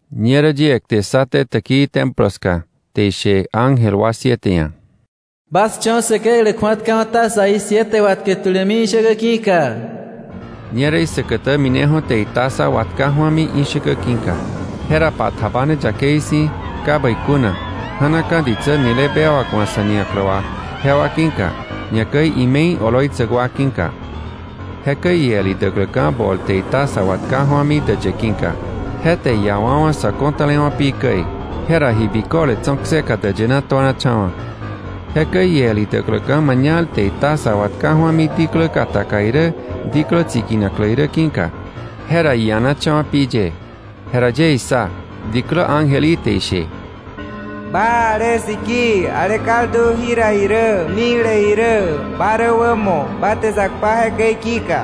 Ñerä yie kte ssaté täkii Templo ska, te ishe ángel wa siete ia̱: “Bas cho̱ Säkeklä kju̱atkawa̱ tazaí siete watkä tulämi ishäkä ki̱ka.” Ñerä isäkätä mineju̱ te itaza watka ju̱ami ishäkä ki̱ka. Jera pa tjabane yakei si̱, ka bäi kuna, ja̱naka̱ ditsä nile bewak wa̱ sa̱ niaklä wà, jewa ki̱ka, ñakäi ime̱i oloitsäk wa ki̱ka. Jekäi iel idäkläka̱ bol te itaza watka ju̱ami däyë ki̱ka; je te iiawa̱wa̱ sä ko̱tälewa̱ pi käi. Jera ji biköle tso̱ kseka däyë na tuanacha̱wa̱. Jekäi iel idäkläka̱ mañal te itaza watka ju̱ami diklä kataka irä, diklä tsiki̱naklä irä ki̱ka, jera ianacha̱wa̱ pi ye. Jera yie issa, diklä ángel í te ishe: “Ba ale sikii, ale kaldu jira irä mikle irä, ba rä wämo; ba te sa kpa jekäi ki̱ka.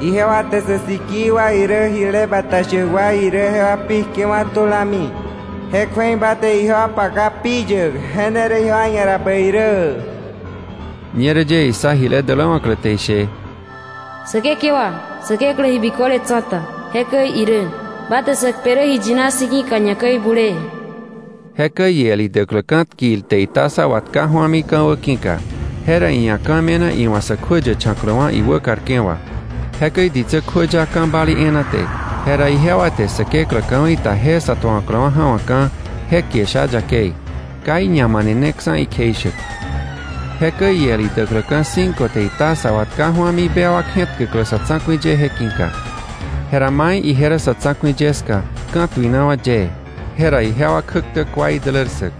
Ijewa te sä sikii wa irä, ji bata shäk wa irä, jewa pi kjewa̱ tulami, je kju̱ei ba te ijewa paka pi yäk, je ne rä bäi ijewa ia̱ rä.” Ñerä yie issa jile däläwa̱klä te ishe: “Säkekewa Säkeklä Ji Biköle Tsa̱ta, jekäi irä, ba te sä kpe rä ji yina si̱ ki̱ka, ñakäi bulee.” Jekäi iel idäkläka̱ tkil te itaza watka ju̱ami ka̱wä ki̱ka, jera iia̱ ka̱ me̱na iwa̱ sä kjuäyächa̱kläwa̱ iwäkarke̱ wà. Jekäi ditsä kjuäya ka̱ balii e̱e̱na te, jera ijewa te Säkeklä ka̱wei ta je sa tuawa̱kläwa̱ ja̱wa̱kka̱ je kie sha yakei, ka iñamaneneksa̱ ikjeishäk. Jekäi iel idäkläka̱ cinco te itaza watka ju̱ami bewak je̱tkäklä sa̱ tsa̱ku̱i ye ki̱ka. Jera mai ije rä sa̱ tsa̱ku̱i ye ska ka̱tuinawa̱ yee. Jera ijewa kjäktä kua idälär ssäk.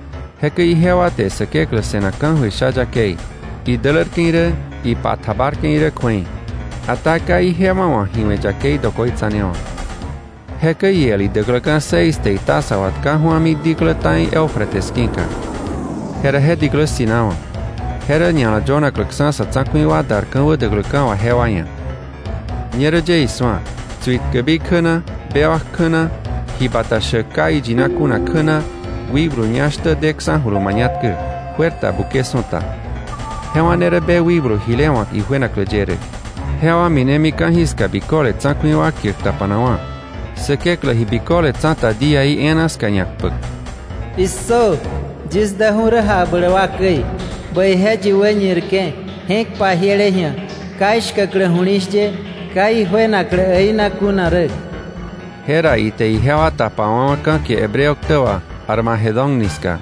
Jekäi ijewa te Säkeklä se̱nak ka̱jöir sha yakei, idälärke̱ irä, ipa tjabarke̱ irä kju̱ei. Ata ka ijewa wa̱ ji we̱ yakei dokoitsanewa̱. Jekäi iel idäkläka̱ seis te itaza watka ju̱ami diklä ta̱i Eufrates ki̱ka. Jera je diklä ssi̱nawa̱, je rä ña̱la yönakläksa̱ sa̱ tsa̱ku̱i wa dar ka̱wä däkläka̱ wà jewa ia̱. Ñerä yie isu̱a, tsuitkäbi kjä na, bewak kjä na, ji bata shäk ka iyina kuna kjä na, wikblu ñá shtä deksa̱julu mañatkä, juer ta buke su̱ta. Jewa ne rä be wikblu jile wa̱k ijuenaklä ye rä. Jewa minemi ka̱jiska biköle tsa̱ku̱i wa kiäk tapanakwa̱, Säkeklä Ji Biköle Tsa̱ta díaí e̱e̱na ska ñakpäk. “¡Issö! Yis däju̱ rä jakbläk wa käi. Bäije yi wäñirke̱, je̱k pajiele ji̱a, ka ishkäklä ju̱li̱shye, ka ijuenaklä äina kuna rä.” Jera ite ijewa tapawa̱wa̱ ka̱ kie Hebreo ktä wà Armagedón ni ska.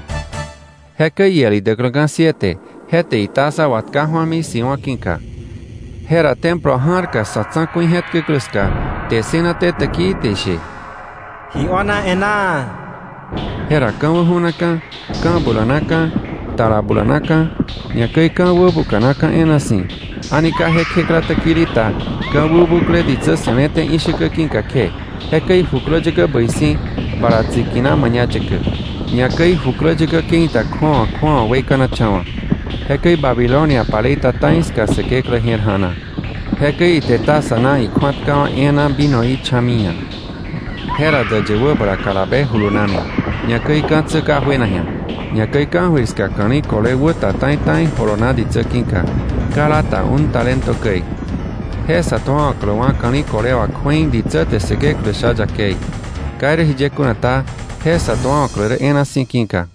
Jekäi iel idäkläka̱ siete, je te itaza watka ju̱ami siwa̱ ki̱ka. Jera templo ja̱rka sa̱ tsa̱ku̱i je̱tkäklä ska kte ssënaté täkii te ishe: “Ji io̱na e̱ná.” Jera ka̱wä ju̱naka̱, ka̱ bulanaka̱, tala bulanaka̱; ñakäi ka̱ wäbuka̱naka̱ e̱e̱na si̱, a̱ni ka je kjekla täkili ta ka̱ wäbukle ditsä se̱le̱té ishäkä ki̱ka kje. Jekäi jukläyäkä bäi si̱ bala tsi̱kina mañayäkä. Ñakäi jukläyäkä ke̱i ta kju̱awa kju̱awa weikanacha̱wa̱. Jekäi Babilonia palei ta ta̱i ska Säkeklä je̱r ja̱na, jekäi ite taza na ikju̱atkawa̱ e̱e̱na vinoí cha̱mi iia̱. Jera däyë wäbala kalabe julunami, ñakäi ka̱tsä ka juena ji̱a. Ñakäi ka̱jöir ska ka̱li̱ kole wäta ta̱i ta̱i jolona ditsä ki̱ka, kala ta un talento käi. Je sa tuawa̱kläwa̱ ka̱li̱ kole wà kju̱ei ditsä te Säkeklä sha yakei. Ka irä jiye kuna ta, je sä tuawa̱klä rä e̱e̱na si̱ ki̱ka.